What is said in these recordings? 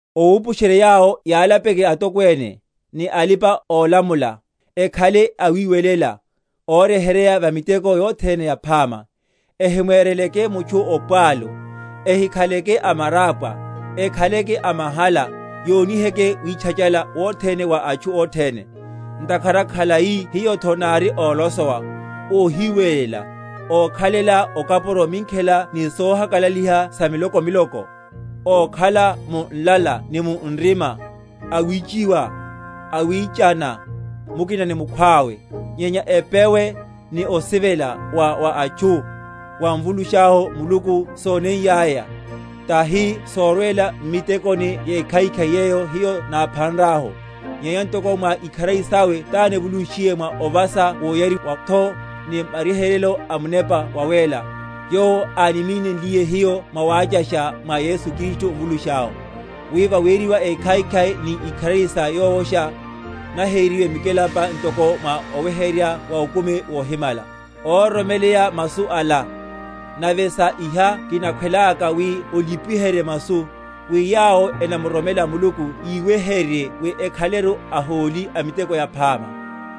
Owupusherye yawo yalapeke atokwene, ni alipa‐olamula, ekhaleke awiwelela, óryeheryeya va miteko yothene yaphama; ehimwereleke mutchu opwalu, ehikhaleke amarapwa, ekhaleke amahala, yoniheke witchachala wothene wa atchu othene. Ntakhara khalai hiyotho nári ólosowa, óhiwelela, ókhalela okapuro minkhela ni sohakalaliha sa milokomiloko, ókhala mu nlala ni mu nrima, awichiwa, awichana mukina ni mukhwawe. Nyenya epewe, ni osivela wa wa atchu, wa Mvulushahu Muluku sóneiyaya, tahi sorwela m’mitekoni yekhaikhai, yeyo hiyo náphanrahu, nyenya ntoko mwa ikharari sawe tánivulunshiye, mwa ovasa woyariwatho ni maryeheryo a Munepa Wawéla, yowo ánimínenle hiyo mwawachasha, mwa Yesu Kristu Mvulushahu; wi vaweriwa ékhaikhai ni ikharari sa Yowosha, naheriwe mikelampa ntoko mwa oweheryerya wa okumi wohimala. Óroromeleya masu ala, nave sa iha kinakhwelaka wi olipiherye masu, wi yawo enamuroromela Muluku yiweheryerye wi ekhaleru aholi a miteko yaphama.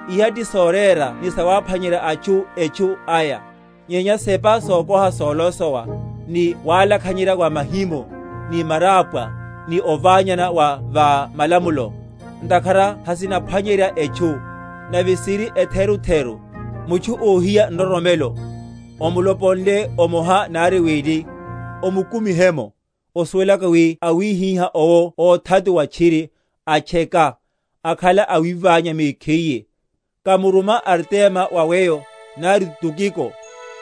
Iha ti sorera ni sawaphwanyerya atchu etchu aya; nyenya sepa sokoha solosowa, ni walakhanyerya wa mahimo, ni marapwa, ni ovanyana wa va malamulo; ntakhara hasinaphwanyerya etchu, nave siri etherutheru. Mutchu óhiya nroromelo, omuloponle omoha nari wili, omukumihe’mo, osuwelaka wi awihiha owo óthatuwa tchiri, atcheka, akhala awiványa mekhiye. Kamuruma Artema wa weyo, nari Tukiko,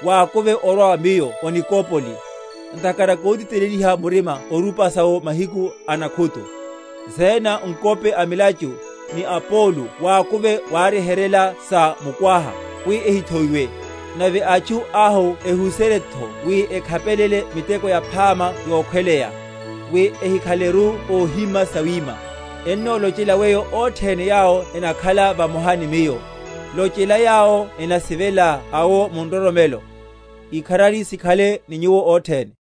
wakuve orwa wa miyo o Nikopoli: ntakhara kotiteleliha murima orupasa’wo mahiku a nakhutu. Zena, ng’wope a milachu, ni Apolo wakuve waryeheryela sa mukwaha, wi ehithoiwe. Nave atchu ahu ehu?-?seryetho wi ekhapelele miteko yaphama yokhweleya, wi ehíkhaleleru óhíma sawima. Ennolochela weyo othene yawo enakhala vamoha ni miyo. Lochela yawo enansivela awo mu nroromelo. Ikharari sikhale ni nyuwo othene.